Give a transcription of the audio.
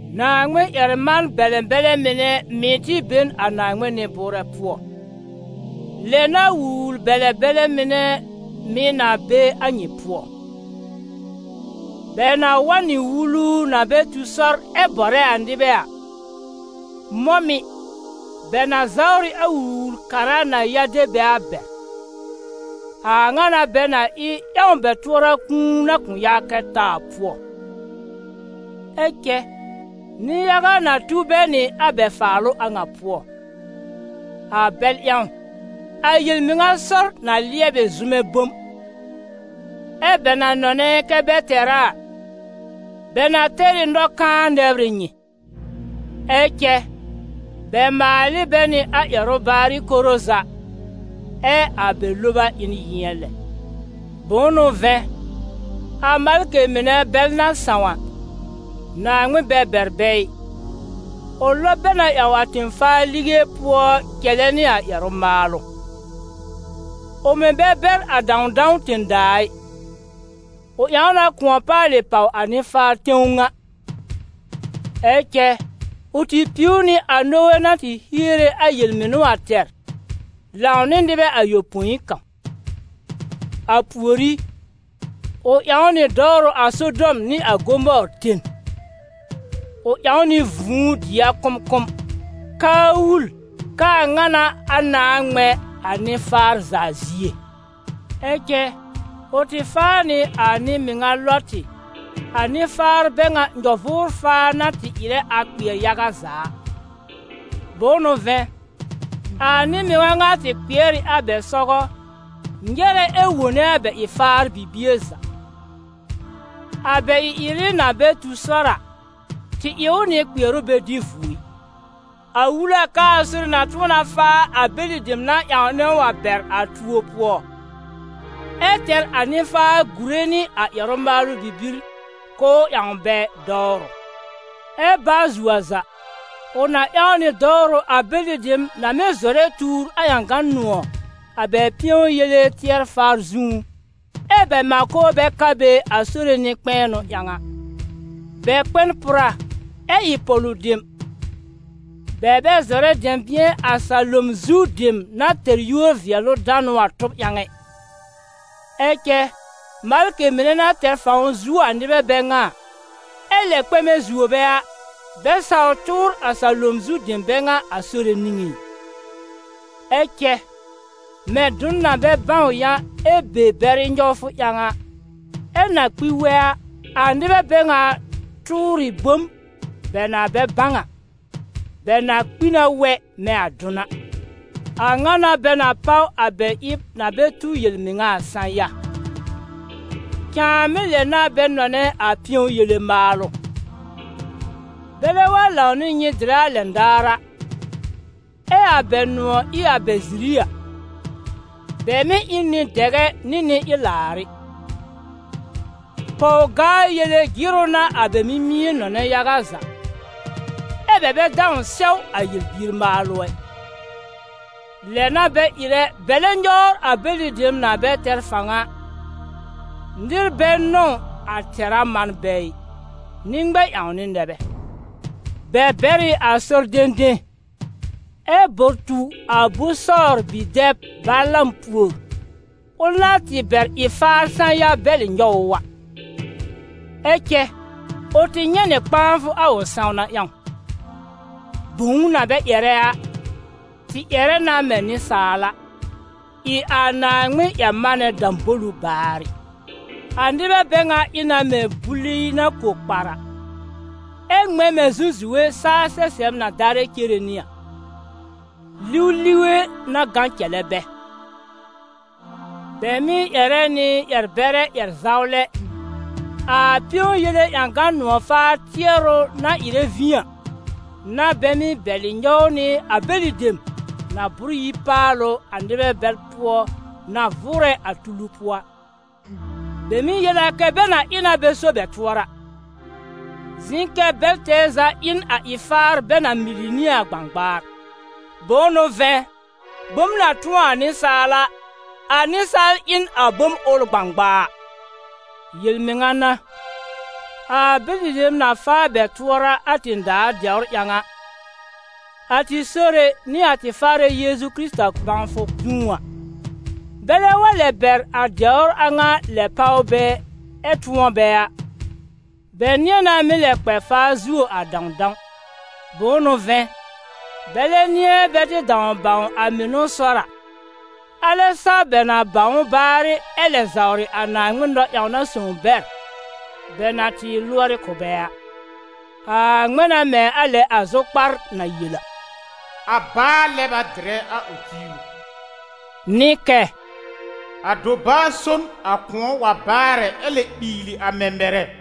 Naaŋmɩn-ƴɛr-man-bɛlɛ bɛlɛ mɩnɛ mɩ̀ tɩ be n a Naaŋmɩn nɩ-bʋʋrɛ pʋɔ. Lɛ n'a wul-wul-bɛlɛ-bɛlɛ mɩnɛ mɩ̀ na be a nyɩ pʋɔ. Bɛ na wa n nɩ wulu na bɛ tu sɔr ɛ bɔrɛ a nɩbɛ a, mɔ̃ mɩ̀, bɛ na zawr ɩ a Wul-wul-kara na ya de bɛ a bɛr. A ŋa n'a bɛ na ɩ ƴãw bɛ tʋɔra kũu na kʋ̃ yaa kɛ ta a pʋɔ. Ɛ cɛ nɩ-yaga na tu bɛ nɩ a bɛ faalʋ a ŋa pʋɔ. A bɛl ƴãw, a yel-mɩŋa sɔr na lɩɛb ɩ zʋmɛ bom. Ɛ́ bɛ na nɔnɛ kɛ bɛ tɛr a a, bɛ na tɛr ɩ nɔ-kãa nɛbr ɩ nyɩ. Ɛ cɛ bɛ maal ɩ bɛ nɩ a ƴɛrʋ baarɩ koro za, ɛ a bɛ loba ɩ n yɩ̃ɛ lɛ. Bʋ̃ʋ n'ʋ vɛ̃, a malkɩ mɩnɛ bɛl na sãw a, Naaŋmɩn bɛ bɛr bɛ ɩ, ʋ lɔb bɛ na ƴãw a tẽ-faa lige pʋɔ cɛlɛ nɩ a ƴɛrʋ-maalʋ. Ʋ mɩ̀ bɛ bɛr a dãwdãw tẽ-daa a ɩ, ʋ ƴãw na kʋ̃ɔ paalɩ pàw a nɩ-faar tẽw ŋa; ɛ cɛ ʋ tɩ piw nɩ a Nowe na tɩ hiere a yel-mɩnʋ a tɛr, lãw nɩ nɩbɛ ayopõi kãw. A pùorí, ʋ ƴãw nɩ dɔwrʋ a Sodɔm nɩ a Gomɔɔr ten. Ʋ ƴãw nɩ vũu dɩ a kʋ̃mkʋ̃m, k'aa wul k'aa ŋa n'a a nãá ŋmɛ̃ a nɩ-faar za zie. Ɛ cɛ ʋ tɩ faa nɩ a nɩ-mɩŋa Lɔtɩ, a nɩ-faar bɛ ŋa nyɔ-vʋʋr-faa na tɩ ɩrɛ a kpɩɛr yaga za a. Bʋ̃ʋ n'ʋ vɛ̃, a nɩ-mɩŋa ŋa tɩ kpɩɛr ɩ a bɛ sɔgɔ, nyɛ̀rɛ ɛ wone a bɛ ɩ-faar bibie za. A bɛ ɩ-ɩrɩ na bɛ tu sɔr a, tɩ ɩ ʋ nɩ kpɩɛrʋ bɛ dɩ vuo ɩ. A wul a k'aa Sore na tʋ̃ɔ na faa a bɛlɩ dem na ƴãwnɛ ʋ a bɛr a tuo pʋɔ, ɛ tɛr a nɩ-faar gùre nɩ a ƴɛrʋ-maalʋ bibir, k'ʋʋ ƴãw bɛ dɔwrʋ. Ɛ baa zuo a za, ʋ na ƴãw nɩ dɔwrʋ a bɛlɩ dem na mɩ́ zɔrɛ tuur a ƴãgan nʋ̃ɔ̀, a bɛ pɩ̃ɔ yele tɩɛr-faa zũú, ɛ́ bɛ mãko bɛ ka be a Sore nɩ-kpɛ̃ɛnʋ ƴãw a. Bɛ kpɛ n pʋra, ɛ ɩ pɔ̀lʋ dem, bɛ bɛ zɔrɛ dɛ̃bɩ̃ɛ a salom zu dem na tɛr yúor-vɩɛlʋ-danʋ a tʋb ƴãw ɛ. Ɛ cɛ malkɩ mɩnɛ na tɛr fãw zuo a nɩbɛ bɛ ŋa, ɛ lɛ kpɛmɛ zuo bɛ a, bɛ sawr tʋʋr a salom zu dem bɛ ŋa a Sore niŋé ɩ. Ɛ cɛ, mɛ̃ dʋn na bɛ bãw yã ɛ be bɛrɩ nyɔwfʋ ƴãw, ɛ na kpi wɛ a, a nɩbɛ bɛ ŋa tʋʋr ɩ bom bɛ na bɛ bãw a, bɛ na kpi na wɛ mɛ̃ a dʋn a. A ŋa n'a bɛ na páw a bɛ ɩb na bɛ tu yel-mɩŋa a sã-ya. Cãàmɩ́ lɛ n'a bɛ nɔnɛ a pɩ̃ɔ yele maalʋ. Bɛlɛ wa lãw nɩ nyɩ dɩrɛ a lɛn daar a, ɛ a bɛ nʋ̃ɔ̀ ɩ a bɛ ziri a, bɛ mɩ́ ɩ n nɩ-dɛgɛ nɩ nɩ-ɩlaarɩ. Pɔw-gaa-yele jɩrʋ n'a a bɛ mimie nɔnɛ yaga za, ɛ́ bɛ bɛ dãw sɛw a yel-bier maalʋ ɛ. Lɛ n'a bɛ ɩrɛ bɛlɛ nyɔwr a bɛlɩ dem na bɛ tɛr fãw a, nɩr bɛ nɔ̃w a tɛ̀rá man bɛ ɩ, nɩ-ŋmɛ-ƴãwnɩ nɛ bɛ. Bɛ bɛr ɩ a sɔr dẽdẽ, ɛ bɔr tu a Bosɔɔr bi-dɛb Balaam pùor, ʋl na tɩ bɛr ɩ-faar sã-ya bɛlɩ nyɔw ʋ a. Ɛ cɛ, ʋ tɩ nyɛ̃ nɩ kpãafʋ a ʋ sãwna ƴãw: bõw na bɛ ƴɛrɛ a, tɩ ƴɛrɛ na mɛ̃ nɩsaal a, ɩ a Naaŋmɩn-ƴɛr-manɛ dãbolu baarɩ. A nɩbɛ bɛ ŋa ɩ na mɛ̃ buli na ko kpar a, ɛ ŋmɛ̃ mɛ̃ zũzuwe saa sɛsɛb na darɛ cere nɩ a. Liw lige n'a gã cɛlɛ bɛ. Bɛ mɩ́ ƴɛrɛ nɩ ƴɛr-bɛrɛ ƴɛr-zawlɛ, a pɩ̃ɔ yele ƴãgan nʋ̃ɔ̀-faar tɩɛrʋ na ɩrɛ vĩ a, n'a bɛ mɩ́ bɛlɩ nyɔw nɩ a bɛlɩ dem na bʋ́r yi paalʋ a nɩbɛ bɛl pʋɔ na vʋʋrɛ a tulu pʋɔ a. Bɛ mɩ́ yel a kɛ bɛ na ɩ na bɛ so bɛ tʋɔra, zɩ̃ kɛ bɛl tɛɛ za ɩ n a ɩ-faar bɛ na mili nɩ a gbãgbaar. Bʋ̃ʋ n'ʋ vɛ̃, bom na tʋ̃ɔ a nɩsaal a, a nɩsaal ɩ n a bom ʋl gbãgbaa. Yel-mɩŋa n'a, a bɛlɩ dem na faa bɛ tuɔra a tẽ-daa dɛwr ƴãw, a tɩ Sore nɩ a tɩ Faarɛ Yeezu Kɩrɩta bãwfʋ zũú a, bɛlɛ wa lɛ bɛr a dɛwr a ŋa lɛ páw bɛ ɛ tʋ̃ɔ bɛ a, bɛ nɩ̃ɛ na mɩ́ lɛ kpɛ faa zuo a dãwdãw. Bʋ̃ʋ n'ʋ vɛ̃, bɛlɛ nɩ̃ɛ bɛ tɩ dãw bãw a mɩnʋ sɔr a, alɛ sa bɛ na bãw ʋ baarɩ ɛ lɛ zawrɩ a Naaŋmɩn nɔ-ƴãwna sõw bɛr, bɛ na tɩ lʋɔrɩ kʋ̀ bɛ a. A ŋmɛ̃ na mɛ̃ a lɛ a zʋkpar na yel a: «A baa lɛb a dɩrɛ a ʋ tiiru!» Nɩ kɛ: «A dobaa so na kʋ̃ɔ wa baarɛ ɛ lɛ miili a mɛ̃mɛrɛ.»